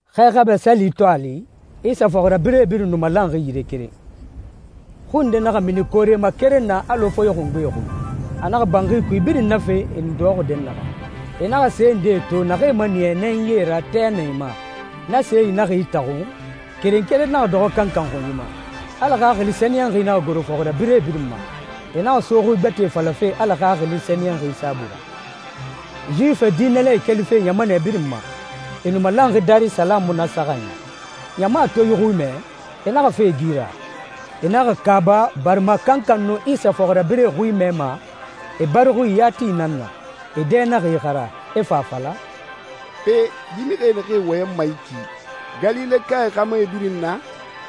Xɛ Xabɛ Sali to a li, Isa fɔxirabirɛe birin nu malanxi yire keren. Xui nde naxa mini koore ma keren na alɔ foye xungbe xui. A naxa banxi kui birin nafe e nu dɔxɔxi dɛnnaxɛ. E naxa se ndee to naxee maniya nɛnyie ra, tɛ na e ma. Na see naxa itaxun, keren keren naxa dɔxɔ kankan xunyi ma. Ala Xaxili Sɛniyɛnxi naxa goro fɔxirabirɛe birin ma, e naxa so xui gbɛtɛe falafe Ala Xaxili Sɛniyɛnxi saabui ra. Yuwifi diinɛlae kelife ɲamanɛ birin ma, e nu malanxi Darisalamu na saxanyi. Ɲama to yi xui mɛ, e naxa fa e gi ra. E naxa kaaba barima kankan nu Isa fɔxirabirɛe xui mɛma e bari xui yati nan na. E dɛ naxa ixara, e fa a fala, «Pe, yi mixie naxee wɔyɛnma yi ki, Galilekae xa mu e birin na?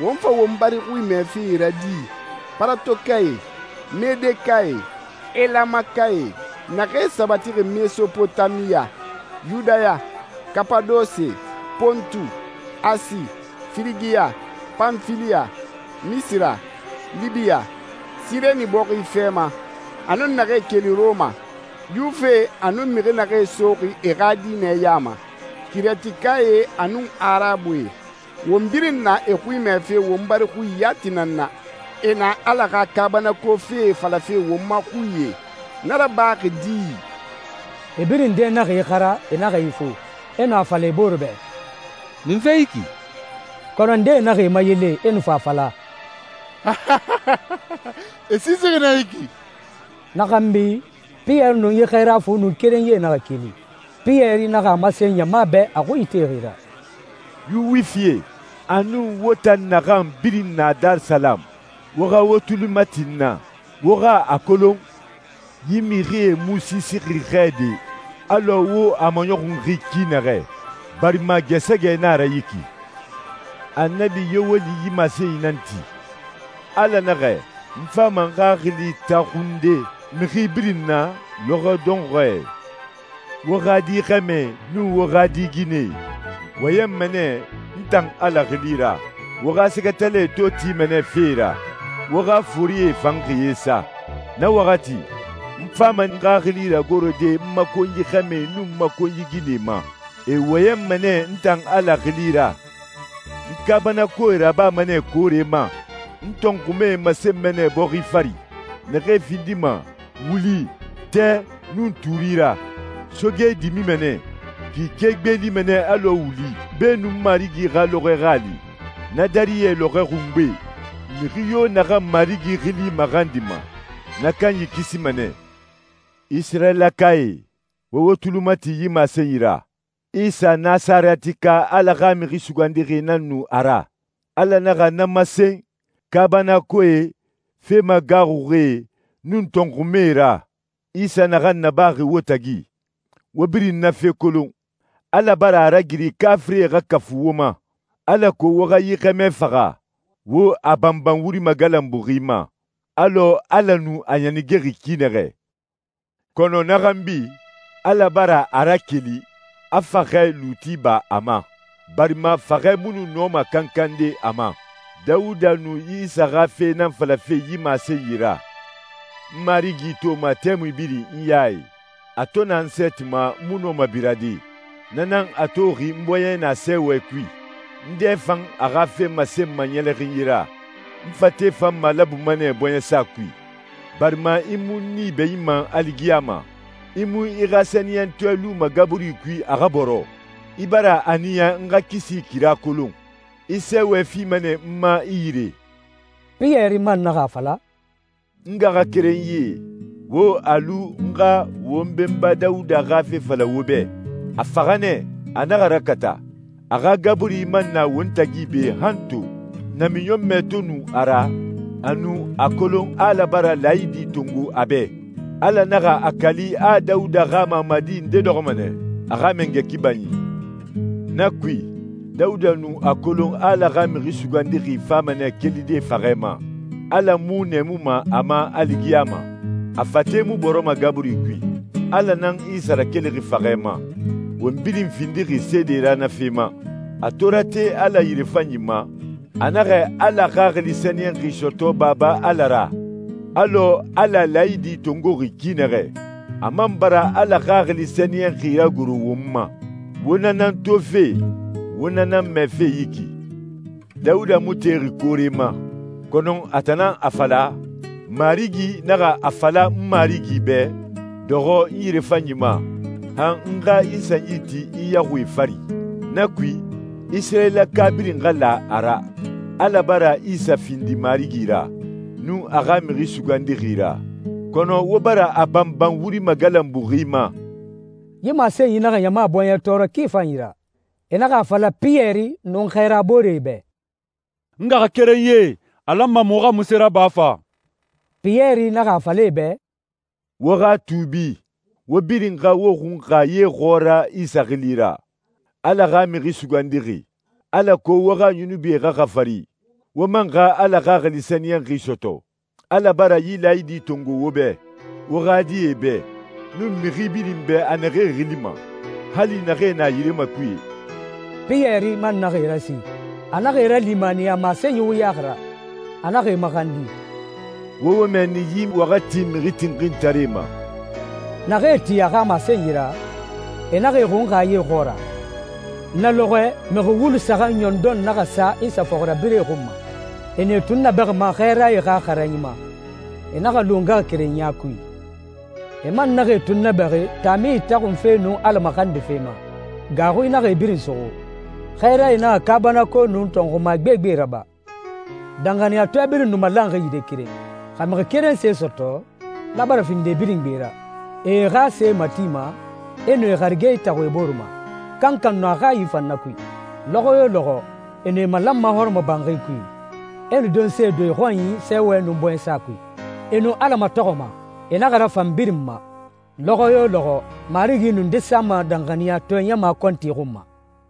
Won fa won bari xui mɛfe e ra di? Paratokae, Medekae, Elamakae, naxee sabatixi Mesopotamiya, Yudaya, Kapadose, Pontu, Asi, Firigiya, Panfiliya, Misira, Libiya, Sireni bɔxi fɛ ma, a nun naxee keli Rɔma, Yuwifie a nun mixi naxee soxi e xa diinɛ ya ma, Kirɛtikae a nun Arabue, won birin na e xui mɛfe won bari xui yati nan na. E na Ala xa kaabanako fee falafe won ma xuie. Na rabaxi di?» E birin dɛ naxa ixara, e naxa ifu. E nu a fala e bore bɛ, «Munfe yi ki?» Kɔnɔ ndee naxa e mayele, e nu fa a fala, «E siisixi nɛ yi ki.» Na xanbi Piyɛri nun yi xɛɛra fu nun kerenyie naxa keli. Piyɛri naxa a masen ɲama bɛ a xui itexi ra, «Yuwifie, a nun wo tan naxan birin na Darisalamu, wo xa wo tuli mati n na. Wo xa a kolon, yi mixie mu siisixi xɛ de alɔ wo a maɲɔxunxi ki naxɛ, barima gɛɛsɛgɛ na a ra yi ki.» «Annabi Yoweli yi masenyi nan ti. ‹Ala naxɛ, n fama n Xaxili taxunde mixi birin na lɔxɔɛ dɔnxɔɛe. Wo xa di xɛmɛe nun wo xa di ginɛe wɔyɛnma nɛ n tan Ala xili ra. Wo xa sɛgɛtalae to tima nɛ fee ra, wo xa forie fan xiyee sa. Na waxati, n fama n Xaxili ragorode n ma konyi xɛmɛe nun n ma konyi ginɛe ma. E wɔyɛnma nɛ n tan Ala xili ra. N kaabanakoee rabama nɛ koore ma, n tɔnxumae masenma nɛ bɔxi fari, naxee findima wuli, tɛ, nun tuuri ra. Soge dimima nɛ, kike gbeelima nɛ alɔ wuli beenun Marigi xa lɔxɔɛ xa a li, na dariyɛ lɔxɔɛ xungbe. Mixi yo naxan Marigi xili maxandima, na kanyi kisima nɛ.›» «Isirayilakae, wo wo tuli mati yi masenyi ra. Isa Nasarɛtika Ala xa Mixi Sugandixi nan nu a ra. Ala naxa na masen kaabanakoee, fe magaaxuxie, nun tɔnxumae ra, Isa naxan nabaxi wo tagi. Wo birin na fee kolon. Ala bara a ragiri kaafirie xa kafu wo ma, alako wo xa yi xɛmɛ faxa, wo a banban wuri magalanbuxi ma, alɔ Ala nu a ɲanigexi ki naxɛ. Kɔnɔ na xanbi, Ala bara a rakeli, a faxɛ luuti ba a ma, barima faxɛ mu nu nɔma kankande a ma.» «Dawuda nu Isa xa fe nan falafe yi masenyi ra. ‹N Marigi toma tɛmui birin n ya i. A to na n sɛɛti ma, n mu nɔma birade. Na nan a toxi n bɔɲɛ na sɛɛwɛ kui, n dɛ fan a xa fe masenma ɲɛlɛxinyi ra. N fate fan malabuma nɛ bɔɲɛsa kui, barima i mu n nii bɛɲinma aligiyama, i mu i xa sɛniyɛntɔɛ luma gaburi kui, a xa bɔrɔ. I bara a niya n xa kisi kira kolon. I sɛɛwɛ fima nɛ n ma i yire.›» Piyɛri man naxa a fala, «N ngaxakerenyie, wo a lu n xa won benba Dawuda xa fe fala wo bɛ. A faxa nɛ, a naxa ragata, a xa gaburi man na won tagi be han to. Namiɲɔnmɛ to nu a ra, a nu a kolon Ala bara laayidi tongo a bɛ. Ala naxa a kali a Dawuda xa mamadi nde dɔxɔma nɛ a xa mangɛ kibanyi. Na kui, Dawuda nu a kolon Ala xa Mixi Sugandixi fama nɛ kelide faxɛ ma. Ala mu nɛɛmuma a ma aligiyama, a fate mu bɔrɔma gaburi kui. Ala nan Isa rakelixi faxɛ ma. Won birin findixi seede ra na fe ma. A to rate Ala yirefanyi ma, a naxa Ala Xaxili Sɛniyɛnxi sɔtɔ Baba Ala ra, alɔ Ala laayidi tongoxi ki naxɛ. A man bara Ala Xaxili Sɛniyɛnxi ragoro won ma. Wo na nan tofe, wo na nan mɛfe yi ki.» «Dawuda mu texi koore ma, kɔnɔ a tan nan a fala, ‹Marigi naxa a fala n Marigi bɛ, Dɔxɔ n yirefanyi ma, han n xa i sanyi ti i yaxuie fari.›» «Na kui, Isirayilaka birin xa la a ra, Ala bara Isa findi Marigi ra, nun a xa Mixi Sugandixi ra. Kɔnɔ wo bara a banban wuri magalanbuxi ma.» Yi masenyi naxa ɲama bɔɲɛ tɔɔrɔ ki fanyi ra. E naxa a fala Piyɛri nun xɛɛra booree bɛ, «N ngaxakerenyie, a lanma muxu xa munse raba fa?» Piyɛri naxa a fala e bɛ, «Wo xa tuubi, wo birin xa wo xunxa ye xɔɔra Isa xili ra, Ala xa Mixi Sugandixi, alako wo xa yunubie xa xafari, wo man xa Ala Xaxili Sɛniyɛnxi sɔtɔ. Ala bara yi laayidi tongo wo bɛ, wo xa die bɛ, nun mixi birin bɛ a naxee xilima, hali naxee na yire makuye.» Piyɛri man naxa e rasi, a naxa e ralimaniya masenyi wuyaxi ra. A naxa e maxandi, «Wo wo mɛɛni yi waxati mixi tinxintaree ma.» Naxee tin a xa masenyi ra, e naxa e xunxa ye xɔɔra. Na lɔxɔɛ mixi wulu saxan ɲɔndɔn naxa sa Isa fɔxirabirɛe xun ma. E nu e tunnabɛxima xɛɛrae xa xaranyi ma. E naxa lu ngaxakerenya kui. E man naxa e tunnabɛxi taami itaxunfe nun Ala maxandife ma. Gaaxui naxa e birin suxu. Xɛɛrae naxa kaabanako nun tɔnxuma gbegbe raba. Danxaniyatɔɛe birin nu malanxi yire keren. Xa mixi keren se sɔtɔ, na bara findi e birin gbe ra. E e xa see matima, e nu e harige itaxun e bore ma, kankan nu a hayi fan na kui. Lɔxɔ yo lɔxɔ e nu e malanma hɔrɔmɔbanxi kui, e nu donse don e xɔnyi sɛɛwɛ nun bɔɲɛsa kui. E nu Ala matɔxɔma. E naxa rafan birin ma. Lɔxɔ yo lɔxɔ Marigi nu nde sama danxaniyatɔɛ ɲama kɔnti xun ma.